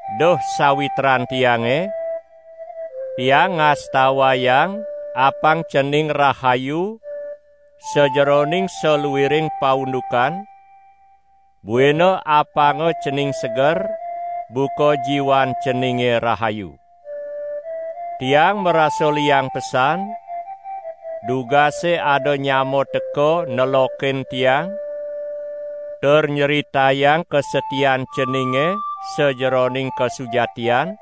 Duh sawitran tiange, tiang ngastawayang apang cening rahayu sajeroning saluiring paundukan, buina apanga cening seger, buka jiwan ceninge rahayu. Tiang marasa liang pesan, dugase ada nyama teka nelokin tiang tur nyritayang kasatian ceninge sajeroning kasujatian,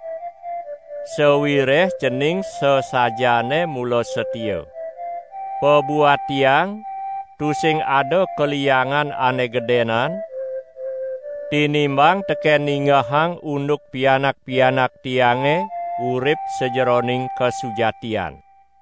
sawireh cening sasajaane mula satia. Pabuat tiang tusing ada kaliangan ane gedenan, tinimbang teken ningehang unduk pianak-pianak tiange urip sajeroning kasujatian.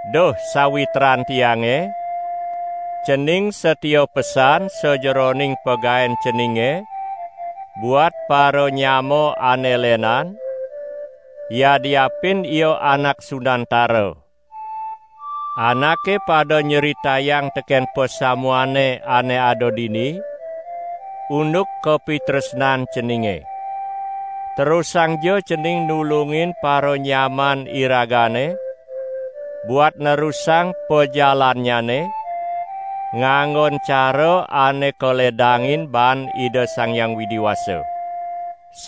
Duh sawitran tiange, cening satia pesan sajeroning pagaen ceninge buat paranyama ane lenan, yadiapin ia anak sunantara. Anake pada nyritayang teken pasamuane ane ada dini unduk kapitresnan ceninge. Terusangja cening nulungin paranyaman iragane buat nerusang pajalannyane, nganggon cara ane kaledangin baan Ida Sang Hyang Widi Wasa.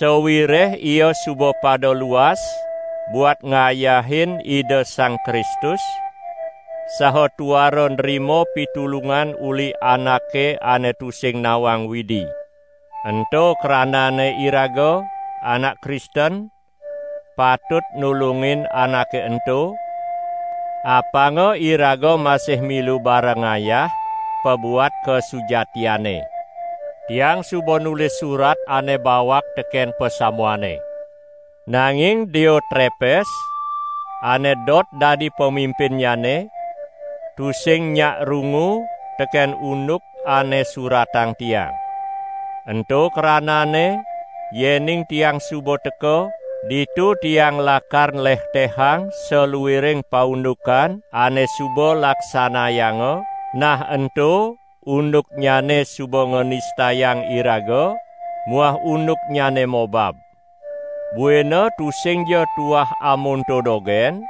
Sawireh ia suba pada luas buat ngayahin Ida Sang Kristus saha tuara nrima pitulungan uli anake ane tusing nawang Widi. Ento kranane iraga, anak Kristen, patut nulungin anake ento, apanga iraga masih milu bareng ngayah pabuat kasujatiane. Tiang suba nulis surat ane bawak teken pasamuane. Nanging Diotrepes, ane dot dadi pamimpinnyane, tusing nyak rungu teken unduk ane suratang tiang. Ento kranane yening tiang suba teka, ditu tiang lakar nlehtehang saluiring paundukan ane suba laksanayanga, nah ento unduknyane suba nganistayang iraga muah unduknyane mobab. Buina tusingja tuah amonto dogen,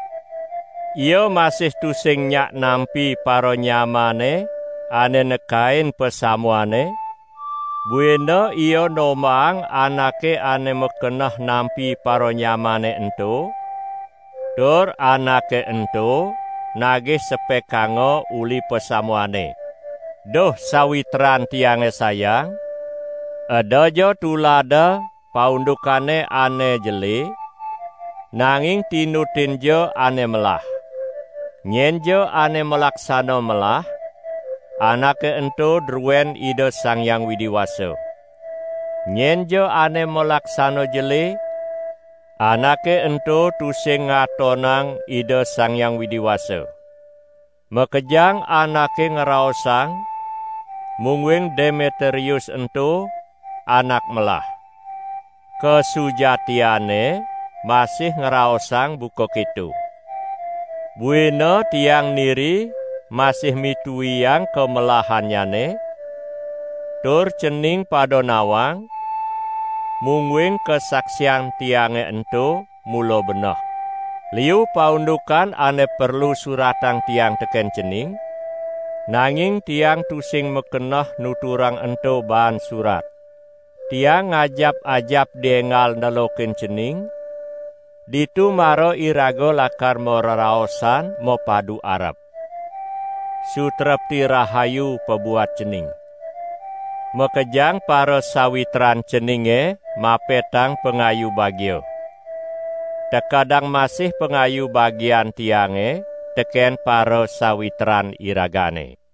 ia masih tusing nyak nampi paranyamane ane nekain pasamuane, buina ia nombahang anake ane makeneh nampi paranyamane ento, tur anake ento nagih sepekanga uli pasamuane. Duh sawitran tiange sayang, edaja tulada paundukane ane jele, nanging tinutinja ane melah. Nyenja ane malaksana melah, anake ento druen Ida Sang Hyang Widi Wasa. Nyenja ane malaksana jele, anake ento tusing ngatonang Ida Sang Hyang Widi Wasa. Makejang anake ngraosang mungguing Demetrius ento anak melah. Kasujatiane masih ngraosang buka keto. Buina tiang niri masih mituiang kamelahannyane, tur cening pada nawang, mungguing kasaksian tiange ento mula beneh. Liu paundukan ane perlu suratang tiang teken cening, nanging tiang tusing makeneh nuturang ento baan surat. Tiang ngajap-ajap dienggal nelokin cening, ditu mara iraga lakar mareraosan mapadu arep. Sutrepti rahayu pabuat cening. Makejang parasawitran ceninge mapetang pangayu bagia. Tekedang masih pangayu bagian tiange teken parasawitran iragane.